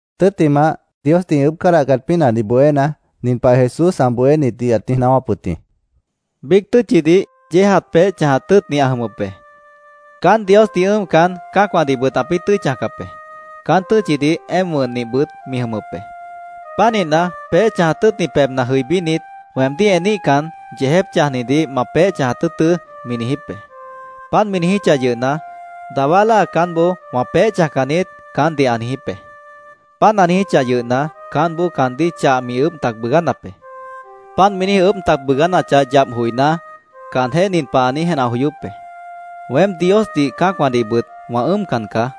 Tʉ́ttimah, Diosdih ĩ ʉʉ́bh cádahcat pínahdih bohéna, nin pah Jesús ã bohénitdih ãt niíj naáwáp wʉt jĩ: “Biíc tʉ́tchidih yéejat peéh chãjat tʉ́ʉtni ã jʉmʉp be. Caán Diosdih ʉ́ʉmcan, cã́acwãdihbʉt ãpĩ́ tʉ́i chãjcap be. Caán tʉ́tchidih éemp wʉnnihbʉt mi jʉmʉp be. Pánihna, peéh chãjat tʉ́ʉtni pebhna jʉibínit, ‘Weemdíh eníhcan, yeejép chãjnidih ma peéh chãjat tʉ́ʉtʉ́’, mi niijíp be. Páant mi niijíchah yʉhna, dawá láa caánboó ‘Wã peéh chãjcan niít’, caántdih ã niijíp be. Páant ã niijíchah yʉhna, caántboó caandíh chah mi ʉʉ́bh tac bʉʉgánap be. Páant mi ʉʉ́bh tac bʉʉgánachah yap joiná, caanjéh nin pah ã niíj jenah joyóp be: ‘Weém Diosdih, cã́acwãdihbʉt wã ʉ́ʉmcan caá.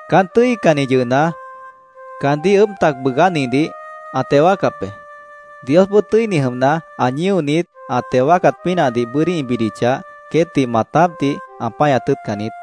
Caán tʉ́icanni yʉhna, caandíh ʉʉ́bh tac bʉʉgánihdih ã teo wáacap be. Diosboó tʉ́ini jʉmna, ã ñíonit ã teo wáacat pínahdih bʉ́dí ĩ bidichah, queétdih maatápdih ã páñat tʉ́ʉtcan niít.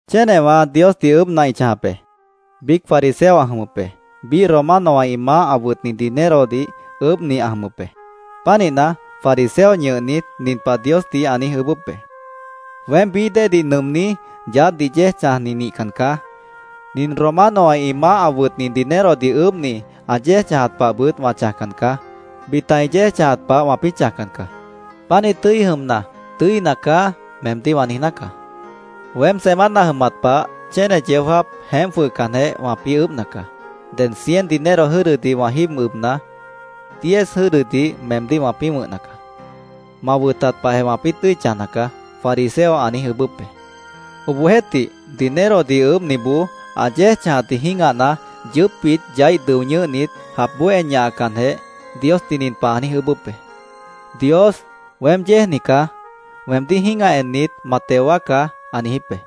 “Chénewã Diosdih ʉʉ́bhna ĩ chãjap be. Biíc fariseo ã jʉmʉp be. Biíh Romanowã ĩ maáh ã wʉtni dinerodih ʉʉ́bhni ã jʉmʉp be. Pánihna, fariseo ñʉhnit, nin pah Diosdih ã niíj ʉʉ́bʉ́p be: ‘Weém bií déedih nʉʉmní, yaádhdih yéej chãjni nihcan caá. Nin Romanowã ĩ maáh ã wʉtni dinerodih ʉʉ́bhni ã yéej chãjat pahbʉt wã chãjcan caá. Bita ĩ yéej chãjat pah wãpĩ́ chãjcan caá. Pánih tʉ́i jʉmna, “Tʉ́ina caá”, meemdíh wã niijná caá. Weém semana jʉmat pah chéne yeó jáap jeémp jwʉhcanjeh, wãpĩ́ ʉʉ́bhna caá. Ded cien dinero jʉ́dʉdih wã jíib ʉbna, diez jʉ́ʉdʉdih meemdíh wãpĩ́ wʉ̃hna caá. Ma wʉtat pahjeh wãpĩ́ tʉ́i chãjna caá’, fariseo ã niíj ʉʉ́bʉ́p be. Obohjeéhtih, dinerodih ʉʉ́bhniboó ã yéej chãjatdih jĩ́gahna, yʉʉ́pbit yaíh dʉo ñʉ́hnit, japboó en ñahacanjeh, Diosdih nin pah ã niíj ʉʉ́bʉ́p be: ‘Dios, weém yéejni caá. Weemdíh jĩ́gah ennit, ma teo wáacá’, ã niijíp be.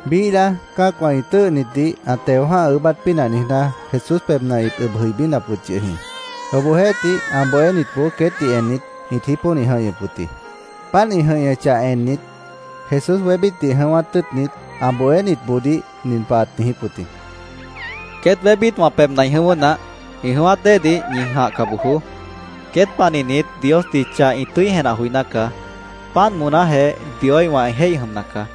Biíh láa, cã́acwã ĩ tʉ́ʉhnitdih ã teo jã́ha ʉʉ́bát pínah niijná, Jesús pebhna ĩt ʉb jʉibínap wʉt yʉh jĩ. Obohjeéhtih ã bohénitboó queétdih ennit, ĩt jípónih jʉ̃ihñʉp wʉt jĩ. Páant ĩ jʉ̃ihñʉchah ennit, Jesús wébítdih jʉ̃ʉ́wát tʉ́ʉtnit, ã bohénitboodíh nin pah ãt niijíp wʉt jĩ: —Queét wébít wã pebhna ĩ jʉ̃ʉ́wʉ́ naáh. Ĩ jʉ̃ʉ́wát déedih ñi jãhca bojoó. Queét panihnit Diosdih chah ĩ tʉ́i jenah joiná caá. Páant moonájeh Dioíhwã ĩ jéih jʉmna caá.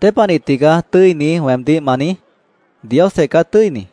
—¿Dépanih tigaá ‘Tʉ́ini’, weemdíh ma niíj? Diosjeh caá tʉ́ini.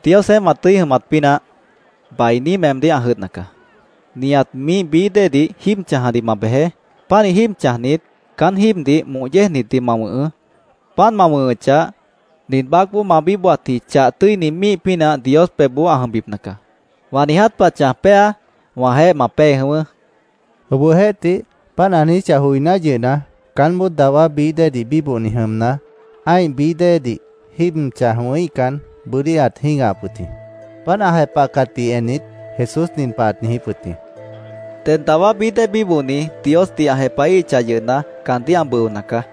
—Diosjeéh ma tʉ́i jʉmat pínah, bainí meemdíh ã jʉdhna caá. Nihat míih bií déedih jíib chãjadih ma bejeé. Pánih jíib chãjnit, caán jíibdih moh yéejnitdih ma wʉ̃hʉʉ́. Páant ma wʉ̃hʉchah, nin baácboó ma bíbohatji chah tʉ́ini míih pínah Dios pebhboó ã jʉmbipna caá. Wã niiját pah chãj péa, wãjeéh ma pée jʉ̃ʉ́wʉ́, Jesús caandíh ãt niijíp wʉt yʉh jĩ. Obohjeéhtih, páant ã niijíchah joiná yʉhna, caánboó dawá bií déedih bíbohni jʉmna, ã́ih bií déedih jíib chãj wʉ̃híhcan, bʉ́dí ãt jĩ́gahap wʉt jĩ. Páant ã jepahcatdih ennit, Jesús nin pah ãt niijíp wʉt jĩ: —Ded dawá bií déedih bíbohni Diosdih ã jepahíhichah yʉhna, caandíh ã bʉona caá.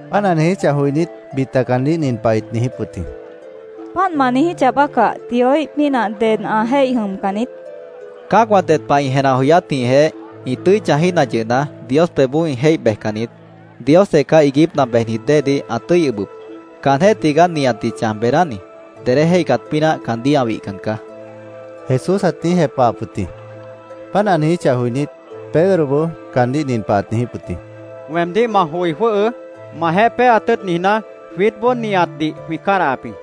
Páant ã niijíchah joinít, bita caandíh nin pah ĩt niijíp wʉt jĩ: —Páant ma niijíchah bácah, Dioíh pínah ded ã jéih jʉmcan niít, ĩt niijíp wʉt jĩ. —Cã́acwã ded pah ĩ jenah joyátjĩhjeh ĩ tʉ́i chãjíhna yʉhna, Dios pebhboó ĩ jéih bejcan niít. Diosjeh caá iiguípna bejnit déedih ã tʉ́i ʉbʉp. Caanjéh tigaá nihatdih chãj beedáni. Dedé jéihcat pínah caandíh ã wihcan caá, Jesús ãt niíj jepahap wʉt jĩ. Páant ã niijíchah joinít, Pedroboó caandíh nin pah ãt niijíp wʉt jĩ: —Weemdíh ma joi jwʉ́hʉʉ́. Majeéh péeat tʉ́ʉt niijná, jwiítboó nihatdih jwĩ cádahap jĩ, ãt niijíp wʉt jĩ.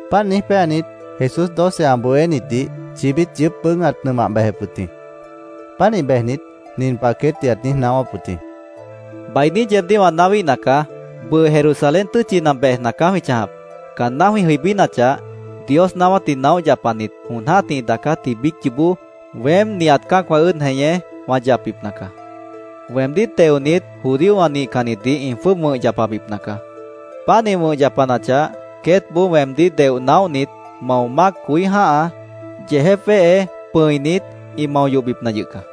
Páant niíj péanit, Jesús doce ã bohénitdih chibít yʉʉ́p bʉʉ́g ãt nʉmah bejep wʉt jĩ. Pánih bejnit, nin pah queétdih ãt niíj naáwáp wʉt jĩ: “Bainí yeebdíh wã naáwíhna caá. Bʉʉ Jerusalén tʉ́tchina bejna caá jwĩ chãjap. Caanná jwĩ jʉibínachah, Dios naáwátdih naóh yapanit jon jã́tih ĩ daacátji biíc yoobó weém nihat cã́acwã ʉ́ʉd jeñé wã yapbipna caá. Weemdíh teonit, judíowã nihcannitdih ĩ jwʉ́ʉb wʉ̃h yapabipna caá. Páant ĩ wʉ̃h yapanachah, queétboó weemdíh deoh naóhnit, mao mác coí jã́ha, yeejép wéhe, pʉ̃init, ĩ mao yohbipna yʉh caá.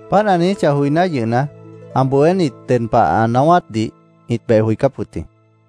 Páant ã niijíchah joiná yʉhna, ã bohénit ded pah ã naáwátdih ĩt beh joicáp wʉt jĩ.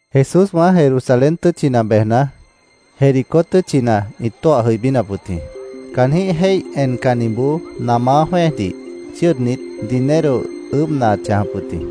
Jesúswã Jerusalén tʉ́tchina bejna, Jericó tʉ́tchina ĩt tóah jʉibínap wʉt jĩ. Caanjĩ́h jéih encanniboó namá jwẽ́ejdih chʉ́ʉdnit, dinero ʉʉ́bhna ãt chãjap wʉt jĩ.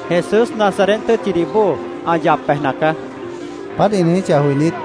—Jesús, Nazaret tʉ́tchidih bóo ã yap bejna caá, caandíh ĩt niíj jepahap wʉt jĩ.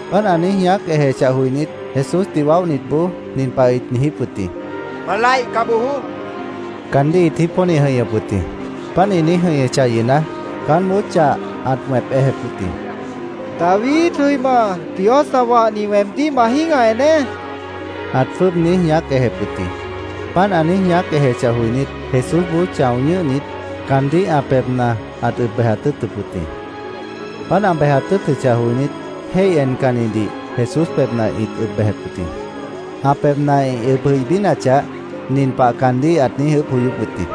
Páant ã niíj ñaác ejechah joinít, Jesúsdih waóhnitboó, nin pah ĩt niijíp wʉt jĩ: —¡Ma laihca bojoó! caandíh ĩt niíj jípónih jʉ̃ihñʉp wʉt jĩ. Páant ĩ niíj jʉ̃ihñʉchah yʉhna, caánboó chah ãt wẽp ejep wʉt jĩ. —¡David jʉima, Dios ã wahni, weemdíh ma jĩ́gah eneé! ãt jwʉ́ʉb niíj ñaác ejep wʉt jĩ. Páant ã niíj ñaác ejechah joinít, Jesúsboó chão ñʉ́hnit, caandíh ã pebhna ãt ʉb bejat tʉ́ʉtʉp wʉt jĩ. Páant ã bejat tʉ́ʉtʉchah joinít, jéih encannidih Jesús pebhna ĩt ʉb bejep wʉt jĩ. Ã pebhna ĩ ʉb jʉibínachah, nin pah caandíh ãt niíj ʉʉ́bh joyóp wʉt jĩ: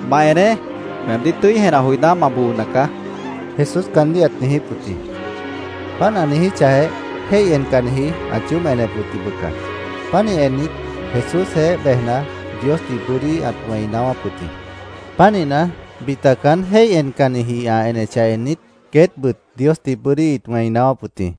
—¡Ma eneé! Weemdíh tʉ́i jenah joiná, ma boona caá, Jesús caandíh ãt niijíp wʉt jĩ. Páant ã niijíchahjeh, jéih encanniji ãt yoób enep wʉt jĩ, bʉca. Pánih ennit, Jesúsjeéh bejna, Diosdih bʉ́dí ãt wẽi naáwáp wʉt jĩ. Pánihna, bita caán jéih encanniji ã enechah ennit, queétbʉt Diosdih bʉ́dí ĩt wẽi naáwáp wʉt jĩ.